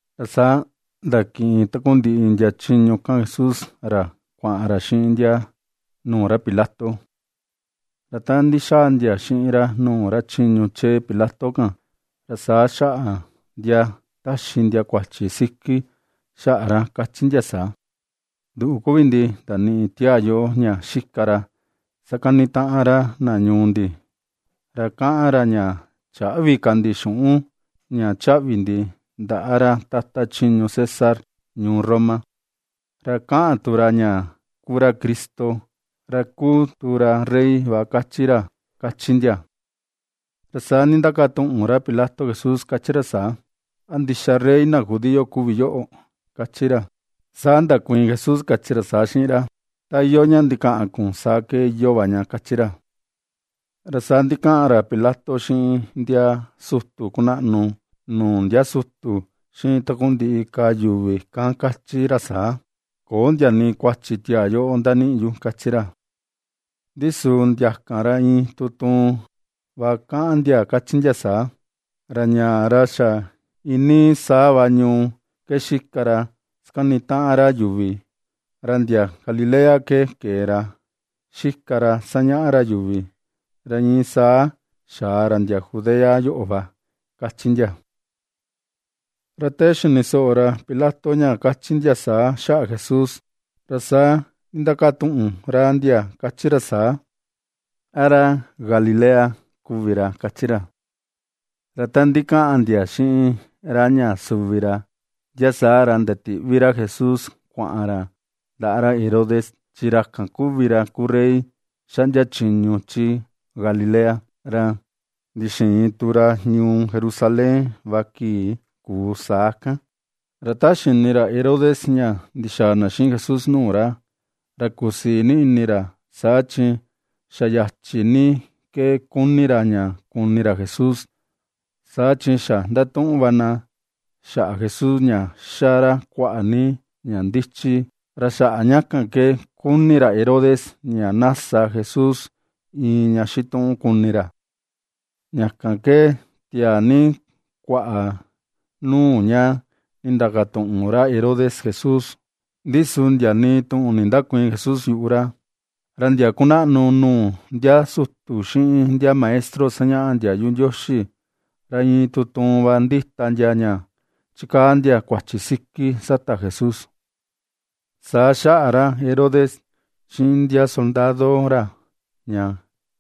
Ra saa ndakiꞌin takundiꞌi ndia chiñu kan Jesús ra kuaꞌan ra xiꞌin ndia nuu ra Pilato. Ra ta ndixaa ndia xiꞌin ra nuu ra chiñu chee Pilato kan, ra saa xaꞌa ndia taxi ndia kuachi siki xaꞌa ra, kachi ndia saa: ―Nduꞌu kuvi ndi ndaniꞌi tiaa yoꞌo ña xika ra sakanitaꞌan ra na ñuu ndi, ra kaꞌan ra, ña chäꞌvi ka ndi xuꞌun ña chaꞌvi ndi ndaꞌa ra tata chiñu César ñuu Roma. Ra kaꞌan tu ra ña kuu ra Cristo, ra kúu tu ra rey va, kachi ra ―kachi ndia. Ra saa ndindakatuꞌun ra Pilato Jesús, kachi ra saa: ―¿A ndixa rey na judío kuvi yoꞌo? ―kachi ra. Saa ndakuiin Jesús, kachi ra saa xiꞌin ra: ―Ta iyoo ña ndikaꞌan kun, saa iyoo va ña ―kachi ra. Ra saa ndikaꞌan ra Pilato xiꞌin ndia sutu kunaꞌnu nuu ndia sutu, xiꞌin takundiꞌi ka yuvi kan, kachi ra saa: ―Köo ndia nii kuachi tiaa yoꞌo ndaniꞌi yu ―kachi ra. Ndi su ndia kan ra iin tuun tuun va kaꞌan ndia, kachi ndia saa: ―Ra ñaa, ra xa iinii saa va ñuu ke xika ra sakanitaꞌan yuvi. Ra ndia Galilea ke kee ra xika ra sañaꞌa ra yuvi, ra iin saa xaa ra ndia Judea yoꞌo va ―kachi ndia. Ra te xini soꞌo ra Pilato ña kachi ndia saa xaꞌa Jesús, ra saa ndindakatuꞌun ra ndia, kachi ra saa: ―¿A ra Galilea kuvi ra? ―kachi ra. Ra ta ndikaꞌan ndia xiꞌin ra ña suvi ra, ndia saa ra ndatiꞌvi ra Jesús kuaꞌan ra ndaꞌa ra Herodes, chi ra kan kuvi ra kuu rey xaꞌndia chiñu chi Galilea. Ra ndixiin tu ra ñuu Jerusalén va kii kuu saa kan. Ra ta xini ra Herodes ña ndixaa na xiꞌin Jesús nuu ra, ra kusii ni ini ra; saa chi xa yachi ni vi ke kuni ra ña kuni ra Jesús, saa chi xa ndatuꞌun va na xaꞌa Jesús, ña xa ra kuaꞌa ni ña ndichi, ra xaꞌa ña kan ke kuni ra Herodes ña na sa Jesús iin ña xituꞌun, kuni ra. Ña kan ke tiaa ni kuaꞌa nuu ña nindakatuꞌun ra Herodes Jesús. Ndi su ndia nii tuꞌun nindäkuiin Jesús yuꞌu ra. Ra ndia kunaꞌnu nuu ndia sutu, xiꞌin ndia maestro sañaꞌa ndiayu Ndioxi, ra iin tutuun va ndita ndia ña chikaa ndia kuachi siki sata Jesús. Saa xaꞌa ra Herodes, xiꞌin ndia soldado ra ña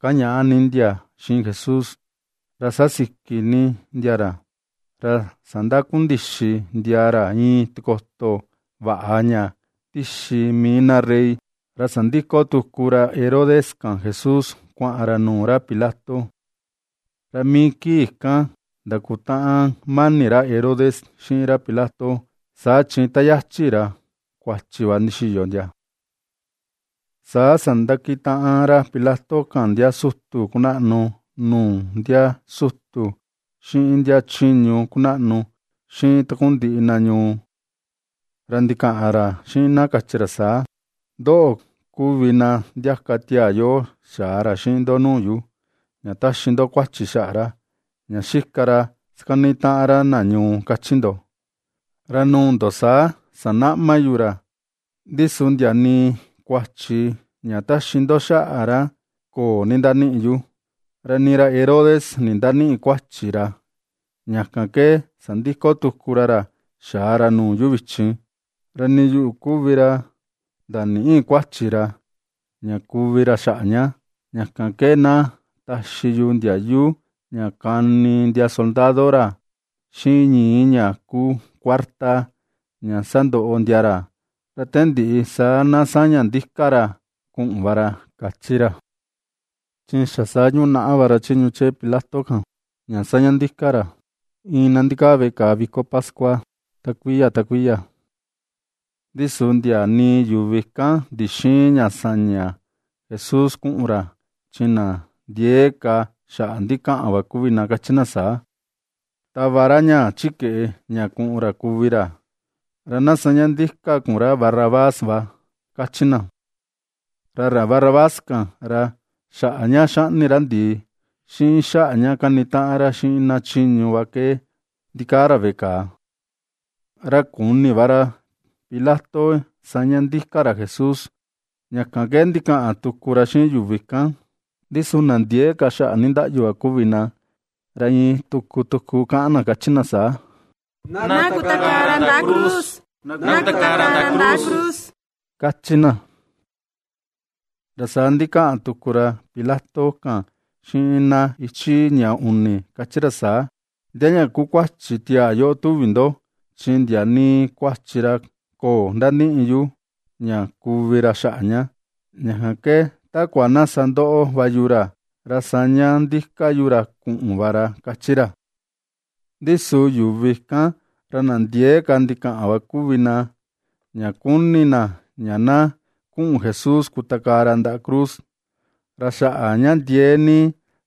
kañaꞌa ni ndia xiꞌin Jesús, ra xa siki ni ndia ra, ra sandakundixi ndia ra iin tikoto vaꞌa ña ndixi mii na rey, ra sandiko tuku ra Herodes kan Jesús kuaꞌan ra nuu ra Pilato. Ra mii kii kan ndakutaꞌan mani ra Herodes xiꞌin ra Pilato, saa chi yachi ra kuachi va ndixiyo ndia. Saa sandakitaꞌan ra Pilato kan, ndia sutu kunaꞌnu nuu ndia sutu, xiꞌin ndia chiñu kunaꞌnu, xiꞌin takundiꞌi na ñuu. Ra ndikaꞌan ra xiꞌin na, kachi ra saa: ―Ndoꞌo kuvi na ndiaka tiaa yoꞌo xaa ra xiꞌin ndo nuu yu, ña taxi ndo kuachi xaꞌa ra, ña xika ra sakanitaꞌan ra na ñuu, kachi ndo, ra nuu ndo saa sanaꞌma yu ra, ndi su ndia nii kuachi ña taxi ndo xaꞌa ra köo nindaniꞌi yu. Ra nii ra Herodes nindanïꞌi kuachi ra, ña kan ke sandiko tuku ra ra xaa ra nuu yu vichin. Ra nii yuꞌu kuvi ra ndanïꞌi kuachi ra, ña kuvi ra xaꞌa ña. Ña kan ke na taxi yu ndiayu, ña kani ndia soldado ra xiꞌin ñii ña kuu kuarta, ña sandoꞌo ndia ra. Ra te ndiꞌi, saa na saña ndika ra kuꞌun va ra ―kachi ra. Chi xa saa yunaꞌa va ra chiñu chee Pilato kan ña saña ndika ra iin na ndikaa veꞌe kàà viko pascua ta kuiya ta kuiya. Ndi su ndia nii yuvi kan, ndixïin ña saña Jesús kuꞌun ra, chi na ndiee ka xaꞌa ndikaꞌan va kuvi na, kachi na saa: ―¡Tava ra ñaa chi keꞌe ña kuꞌun ra kuvi ra, ra na saña ndika kun ra Barrabás va! ―kachi na. Ra ra Barrabás kan, ra xaꞌa ña xaꞌni ra ndii, xiꞌin xaꞌa ña kanitaꞌan ra xiꞌin na chiñu va ke ndikaa ra veꞌe kàà. Ra kuni va ra Pilato saña ndika ra Jesús, ña kan ke ndikaꞌan tuku ra xiꞌin yuvi kan. Ndi su na ndiee ka xaꞌa nindaꞌyu va kuvi na, ra iin tuku tuku kaꞌan na kachi na saa: ―¡Na kutakaa ra ndaꞌa cruz, na kutakaa ra ndaꞌa cruz! ―kachi na. Ra saa ndikaꞌan tuku ra Pilato kan xiꞌin na ichi ña uni, kachi ra saa: ―¿Ndia ña kuu kuachi tiaa yoꞌo tuvi ndo? Chi ndia nii kuachi ra köo ndaniꞌi yu ña kuvi ra xaꞌa ña; ña kan ke takua na sandoꞌo va yu ra, ra saa saña ndika yu ra kuꞌun va ra ―kachi ra. Ndi su yuvi kan, ra na ndiee ka ndikaꞌan va kuvi na, ña kuni na ña na kuꞌun Jesús kutakaa ra ndaꞌa cruz. Ra xaꞌa ña ndiee ni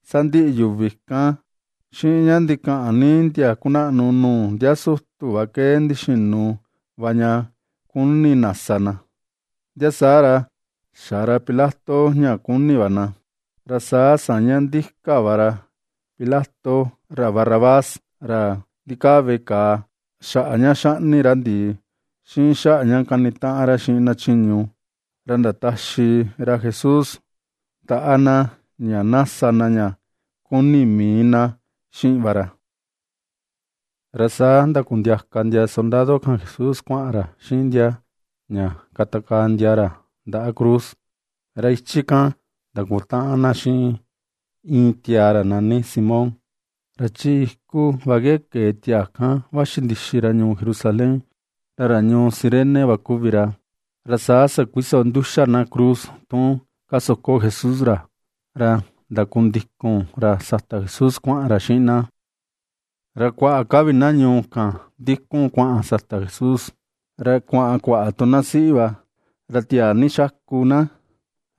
sandiꞌi yuvi kan, xiꞌin ña ndikaꞌan ni ndia kunaꞌnu nuu ndia sutu va ke ndixinu va ña kuni na sa na. Ndia saa ra xa ra Pilato ña kuni va na. Ra saa saña ndika va ra Pilato, ra Barrabás, ra ndikaa veꞌe kàà xaꞌa ña xaꞌni ra ndii, xiꞌin xaꞌa ña kanitaꞌan ra xiꞌin na chiñu, ra ndataxi ra Jesús ndaꞌa na ña sa na ña kuni mii na xiꞌin va ra. Ra saa ndakundiaka ndia soldado kan Jesús kuaꞌan ra xiꞌin ndia ña katakaa ndia ra ra ndaꞌa cruz, ra ichi kan ndakutaꞌan na xiꞌin iin tiaa ra nani Simón, ra chi iku va ke kee tiaa kan vaxi ndixi ra ñuu Jerusalén, ra ra ñuu Cirene va kuvi ra. Ra saa sakuiso nduxa na cruz tun kasoko Jesús ra, ra ndakundikun ra sata Jesús kuaꞌan ra xiꞌin na. Ra kuaꞌa ka vi na ñuu kan ndikun kuaꞌan sata Jesús, ra kuaꞌan kuaꞌa tu na siꞌi va, ra tiaa ni xaku na,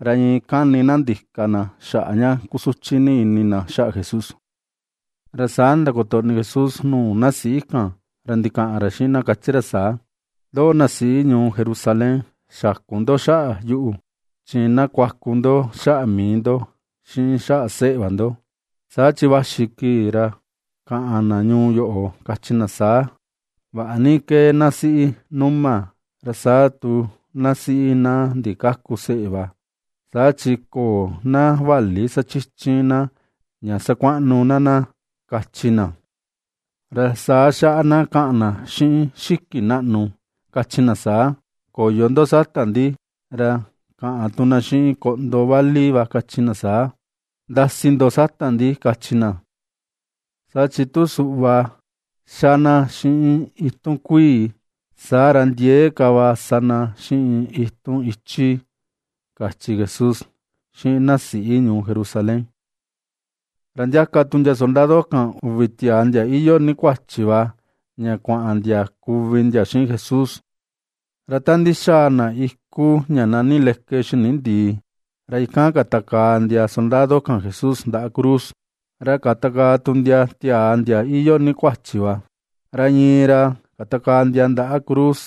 ra iin kani na ndika na xaꞌa ña kusuchi ni ini na xaꞌa Jesús. Ra saa ndakotoꞌni Jesús nuu na siꞌi kan, ra ndikaꞌan ra xiꞌin na, kachi ra saa: ―Ndoꞌo, na siꞌi ñuu Jerusalén, xäku ndo xaꞌa yuꞌu, chi na kuaku ndo xaꞌa mii ndo, xiꞌin xaꞌa seꞌe va ndo. Saa chi vaxi kii ra kaꞌan na ñuu yoꞌo, kachi na saa: “Vaꞌa ni ^kee na siꞌi numa, ra saa tu na siꞌi na ndikäku seꞌe va, saa chi köo na vali sachichin na ña sakuaꞌnu na na” ―kachi na. Ra saa xaꞌa na kaꞌan na xiꞌin xiki naꞌnu, kachi na saa: “Koyo ndo sata ndi”; ra kaꞌan tu na xiꞌin koꞌndo vali va kachi na: “Ndasi ndo sata ndi”, kachi na. Saa chi tu suꞌva xa na xiꞌin itun kuii, saa ra ndiee ka va sa na xiꞌin itun ichi ―kachi Jesús xiꞌin na siꞌi ñuu Jerusalén. Ra ndiaka tu ndia soldado kan, uvi tiaa ndia iyoo ni kuachi va ña kuaꞌan ndia kuvi ndia xiꞌin Jesús. Ra ta ndixaa na iku ña nani Leke Xini Ndìì, ra ikan katakaa ndia soldado kan Jesús ndaꞌa cruz, ra katakaa tu ndia tiaa ndia iyoo ni kuachi va, ra iin ra katakaa ndia ndaꞌa cruz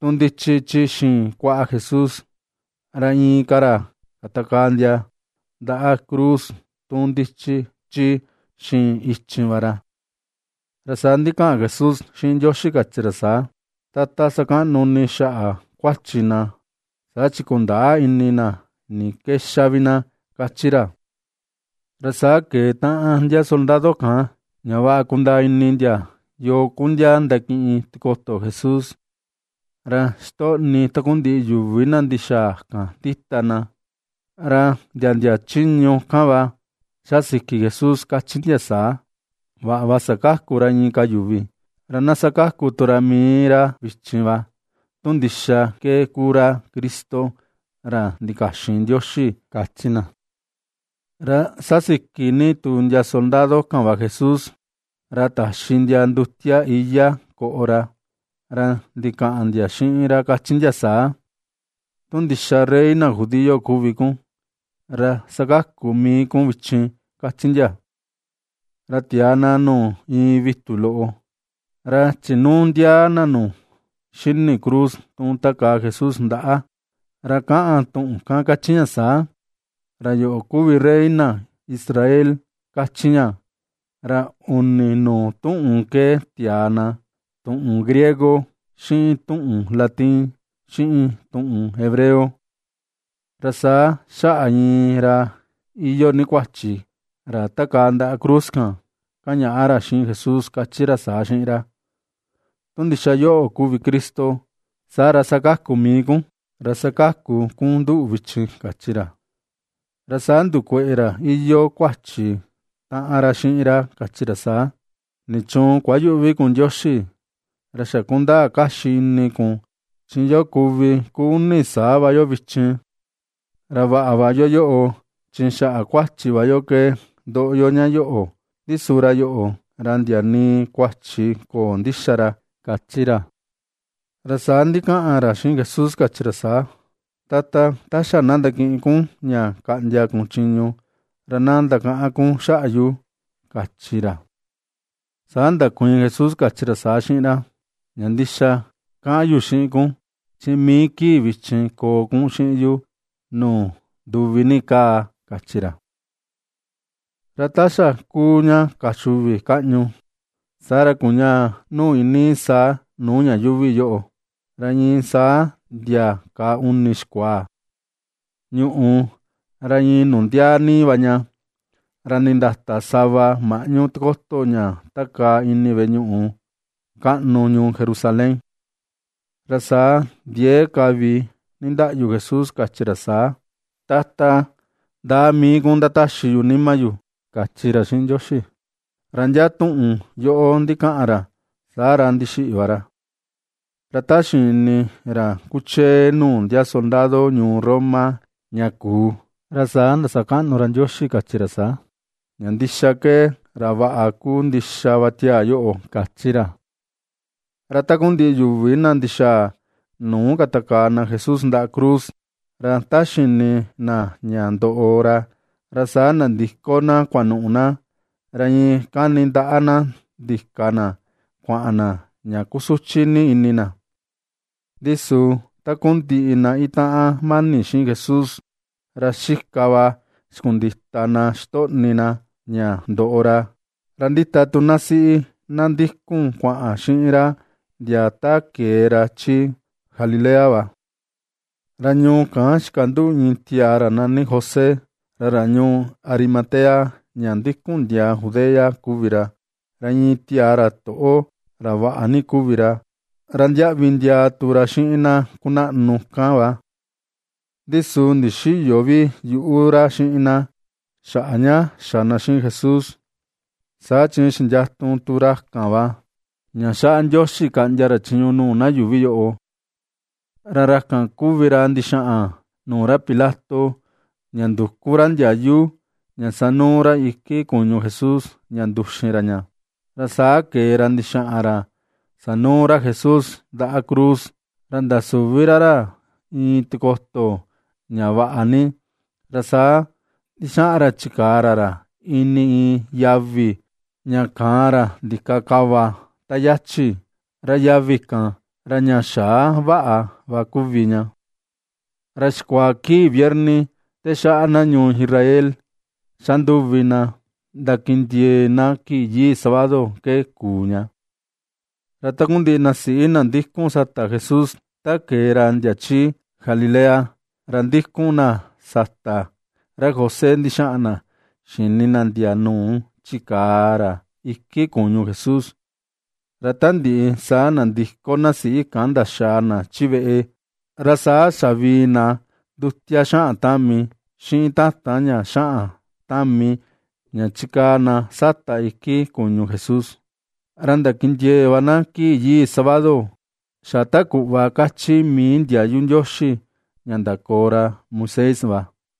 tu ndichi chi xiin kuaꞌa Jesús, ra inka ra katakaa ndia ndaꞌa cruz tu ndichi chi xiin ichin va ra. Ra saa ndikaꞌan Jesús xiꞌin Ndioxi, kachi ra saa: ―Tata, sakaꞌnu ini xaꞌa kuachi na, saa chi kundäa ini na ni ke xa vi na ―kachi ra. Ra saa keꞌe taꞌan ndia soldado kan, ña vaꞌa kundaa ini ndia yoo ku ndia ndakiꞌin tikoto Jesús. Ra xitoꞌni takundiꞌi yuvi na ndixaa kan ndita na, ra ndia ndia chiñu kan va ^xa siki Jesús, kachi ndia saa: ―Vaꞌa va sakaku ra inka yuvi, ra na sakaku tu ra mii ra vichin va tu ndixa ke kuu ra Cristo, ra ndikaxin Ndioxi ―kachi na. Ra xasiki ni tu ndia soldado kan va Jesús, ra taxi ndia ndutia iyá koꞌo ra, ra ndikaꞌan ndia xiꞌin ra, kachi ndia saa: ―Tu ndixa rey na judío kuvi kun, ra sakaku mii kun vichin ―kachi ndia. Ra tiaa na nuu iin vitu loꞌo, ra chinuu ndiaa na nu xini cruz tu takaa Jesús ndaꞌa, ra kaꞌan tuꞌun kan kachi ña saa: “Ra yoꞌo kuvi rey na Israel”, kachi ña, ra uni nuu tuꞌun ke tiaa na, tuꞌun griego, xiꞌin tuꞌun latin, xiꞌin tuꞌun hebreo. Ra saa xaꞌa iin ra iyoo ni kuachi, ra takaa ndaꞌa cruz kan, kañaꞌa ra xiꞌin Jesús, kachi ra saa xiꞌin ra: ―Tu ndixa yoꞌo kuvi Cristo, saa ra sakaku mii kun, ra sakaku kun nduꞌu vichin ―kachi ra. Saa ndukueꞌe ra iyoo kuachi taꞌan ra xiꞌin ra, kachi ra saa: ―¿Nichuun kuayüꞌvi kun Ndioxi? Ra xa kundaa kaxi ini kun chi yo kuvi ku uni saa va yo vichin. Ra vaꞌa va yoo chi xaꞌa kuachi va yo ke ndoꞌo yo ña yoꞌo, ndi su ra yoꞌo, ra ndia nii kuachi köo ndixa ra ―kachi ra. Ra saa ndikaꞌan ra xiꞌin Jesús, kachi ra saa: ―Tata, ta xa na ndakiꞌin kun ña kaꞌndia kun chiñu, ra na ndakaꞌan kun xaꞌa yu ―kachi ra. Saa ndakuiin Jesús, kachi ra saa xiꞌin ra: ―Ña ndixa kaꞌan yu xiꞌin kun, chi mii kii vichin koo kun xiꞌin yu nuu nduvi ni kaa ―kachi ra. Ra ta xa kuu ña kaa uxi uvi kaꞌñu, saa ra kuñaa nuu iinii saa nuu ña yuuvi yoꞌo, ra iin saa ndia ka uni xikuaa. Ñuꞌù, ra iin nundiaa ni va ña, ra nindata sava maꞌñu tikoto ña takaa ini veꞌe ñuꞌu kaꞌnu ñuu Jerusalén. Ra saa ndiee ka vi nindaꞌyu Jesús, kachi ra saa: ―¡Tata, ndaꞌa mii kun ndataxi yu nima yu! ―kachi ra xiꞌin Ndioxi. Ra ndia tuꞌun yoꞌo ndikaꞌan ra, saa ra ndixiꞌi va ra. Ra ta xini ra kuchee nuu ndia soldado ñuu Roma ña kuu, ra saa ndasakaꞌnu ra Ndioxi, kachi ra saa: ―Ña ndixa ke, ra vaꞌa ku ndixa va tiaa yoꞌo ―kachi ra. Ra takundiꞌi yuvi na ndixaa nuu katakaa na Jesús ndaꞌa cruz, ra ta xini na ña ndoꞌo ra, ra saa nandiko na kuanuꞌu na, ra iin kani ndaꞌa na ndika na kuaꞌan na, ña kusuchi ni ini na. Ndi su takundiꞌi na itaꞌan mani xiꞌin Jesús, ra xika va xikundita na xitoꞌni na ña ndoꞌo ra, ra ndita tu na siꞌi na ndikun kuaꞌan xiꞌin ra ndia ta kee ra chi Galilea va. Ra ñuu kan, xikanduꞌu iin tiaa ra nani José, ra ra ñuu Arimatea ña ndikun ndiaa Judea kuvi ra, ra iin tiaa ra toꞌo, ra vaꞌa ni kuvi ra, ra ndiaꞌvi ndiaa tu ra xiꞌin na kunaꞌnu kan va. Ndi su ndixïyo vi yuꞌu ra xiꞌin na, xaꞌa ña xa na xiꞌin Jesús. Saa chi xindiatu tu ra kan va ña xaꞌa Ndioxi kaꞌndia ra chiñu nuu na yuuvi yoꞌo. Ra ra kan kuvi ra ndixaꞌan nuu ra Pilato, ña nduku ra ndiayu ña sanuu ra iki kuñu Jesús ña nduxin ra ña. Ra saa kee ra ndixaꞌan ra sanuu ra Jesús ndaꞌa cruz, ra ndasuvi ra ra iin tikoto ña vaꞌa ni, ra saa ndixaꞌan ra chikaa ra ra ini iin yavi ña kaan ra ndika kava ta yachi, ra yavi kan ra ña xaa vaꞌa va kuvi ña. Ra xikuaa kii viernes te xaꞌa na ñuu Israel xa nduvi na ndakindiee na kii yii sábado ke kuu ña. Ra takundiꞌi na siꞌi na ndikun sata Jesús ta kee ra ndia chi Galilea, ra ndikun na sata ra José ndixaꞌan na xini na ndia nuu chikaa ra iku kuñu Jesús. Ra ta ndiꞌi, saa nandiko na siꞌi kan ndaxaa na chi veꞌe, ra saa xavii na ndutia xaꞌan tami, xiꞌin tatan ña xaꞌan tami, ña chikaa na sata iki kuñu Jesús. Ra ndakindiee̱ va na kii yii sábado, xa ta kuꞌva kachi mii ndiayu Ndioxi ña ndakoo ra Moisés va.